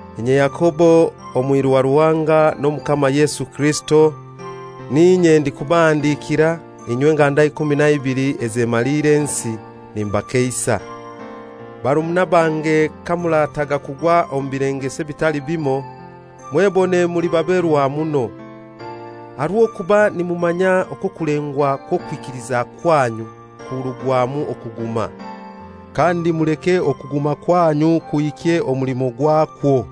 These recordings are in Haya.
Inye Yakobo, omwiru wa Ruhanga n'Omukama Yesu Kirisito, n'inye ndikubahandikira, inywe nganda ikumi na ibili ezemaliire ensi. Nimbakeisa. Barumuna bange, kamurata kugwa omu bilengeso ebitali bimoi, mwebone muli baberwa muno. Aha rw'okuba nimumanya okwo okulengwa kw'okwikiliza kwanyu kurugwamu okuguma. Kandi muleke okuguma kwanyu kuhikye omulimo gwakwo,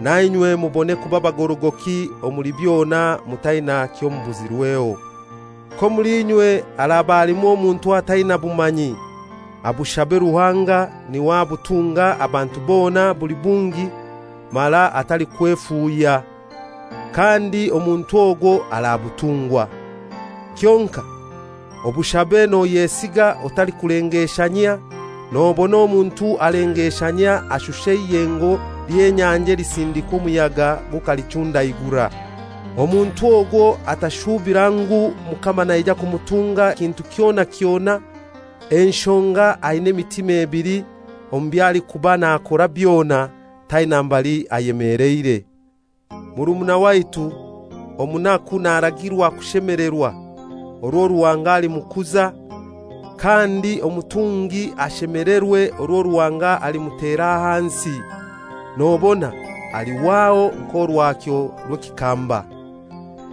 nainywe mubone kuba bagorogoki omuli byona mutaina kyomubuzirweho. K'omuli inywe haraba halimu omuntu ataina bumanyi, abushabe Ruhanga, niwe abutunga abantu bona buli bungi mara atalikwefuuhya, kandi omuntu ogwo arabutungwa. Kyonkai obushabe noyesiga otalikulengeshanyia, nobona omuntu alengeshanyia ashusha eiyengo ly'enyanja elisindikwa omuyaga gukalichundaigura. Omuntu ogwo atashuubira ngu Mukama naija kumutunga kintu kyona kyona, enshonga aina emitima ebili omu by'alikuba nakora byona; taina mbali ayemeleire. Murumuna waitu omunaku naragirwa kushemelerwa orwo Ruhanga alimukuza, kandi omutungi ashemelerwe orwo Ruhanga alimutera ahansi, nobona alihwaho nk'orwakyo rw'ekikamba.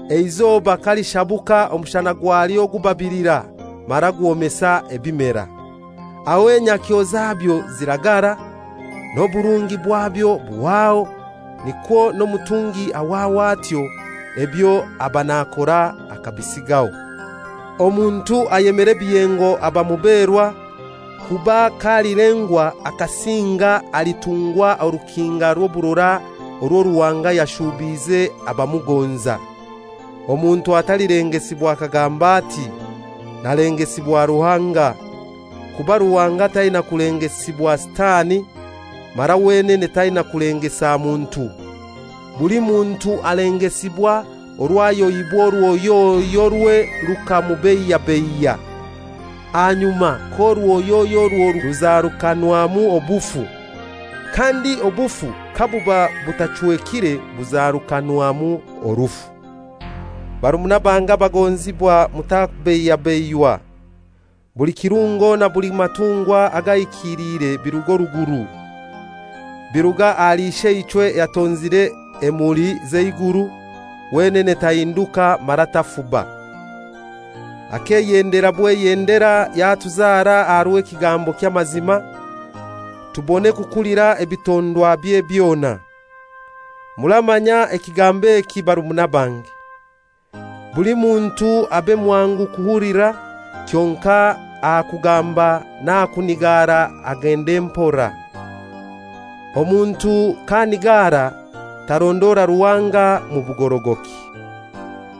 Eizoba kalishabuka omushana gwalyo gubabilira mara gwomesa ebimera. Aho enyakyo zabyo ziragara, n'oburungi bwabyo buhwaho. Nikwo n'omutungi ahwaho atyo, ebyo aba nakora akabisigaho. Omuntu ayemera ebiyengo aba muberwa, kuba k'alilengwa akasinga alitungwa orukinga rw'oburora orwo Ruhanga yashuubiize abamugonza. Omuntu atalilengesibwa akagamba ati, «Nalengesibwa Ruhanga;» kuba Ruhanga taina kulengesibwa Sitani, mara wenene taina kulengesa muntu. Buli muntu alengesibwa orwo ayohibwa orwoyoyorwe rukamubeiyabeiya. Ahanyuma k'orwoyoyo orwo rukura ruzarukanwamu obufu. Kandi obufu kabuba butachwekire buzarukanwamu orufu. Barumuna bange abaagonzibwa, mutabeiyabeiywa. Buli kirungo na buli matungwa agahikilire biruga oruguru, biruga ahali Isheichwe ayatonzire emuli z'eiguru, wenene tahinduka mara tafuba. Akeyendera bweyendera yatuzara aha rw'ekigambo ky'amazima, tubone kukulira ebitondwabye byona. Muramanya ekigambo eki barumuna bange. Buli muntu abe mwangu kuhulira, kyonkai aha kugamba n'aha kunigara agende mpora. Omuntu k'anigara tarondora Ruhanga mu bugorogoki.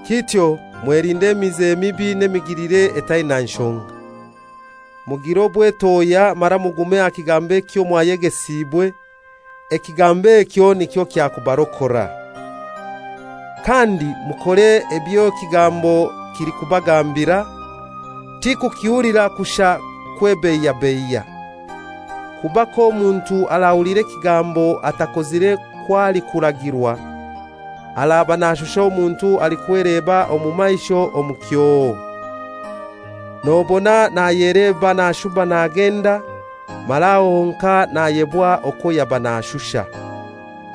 Kityo mwelinde emize mibi n'emigilire etaina nshonga. Mugire obwetohya mara mugume aha kigambo ekyo mwayegesiibwe, ekigambo ekyo nikyo kyakubarokora. Kandi mukore eby'ekigambo kilikubagambira, ti kukihulira kushai kwebeiyabeiya. Kuba k'omuntu arahulira ekigambo atakozire kw'alikuragirwa, araba nashusha omuntu alikweleba omu maisho omu kyoo. Nobona nayeleba nashuba nagenda, mara aho honkai nayebwa okwo yaba nashusha.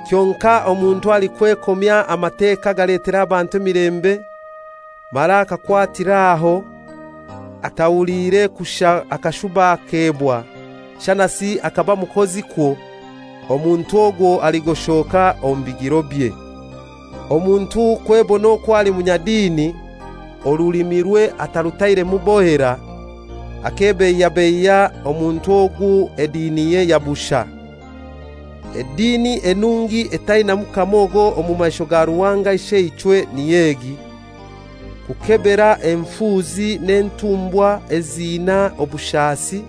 Kyonkai omuntu alikwekomya Amateka agaletera abantu emilembe, mara akakwatir'aho, atahuliire kushai akashuba akebwa, shanasi akaba mukozikwo, omuntu ogwo aligoshoka omu bigirobye. Omuntu kwebona okwo ali munyadini, orulimirwe atarutairemu bohera, akebeiyabeiya, omuntu ogu ediniye ya bushai. Edini enungi etainamu kamogo mu maisho ga Ruhanga Isheichwe niy'egi: Kukebera enfuuzi n'entumbwa eziina obushaasi,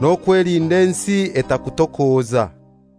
n'okwelinda ensi etakutokoza.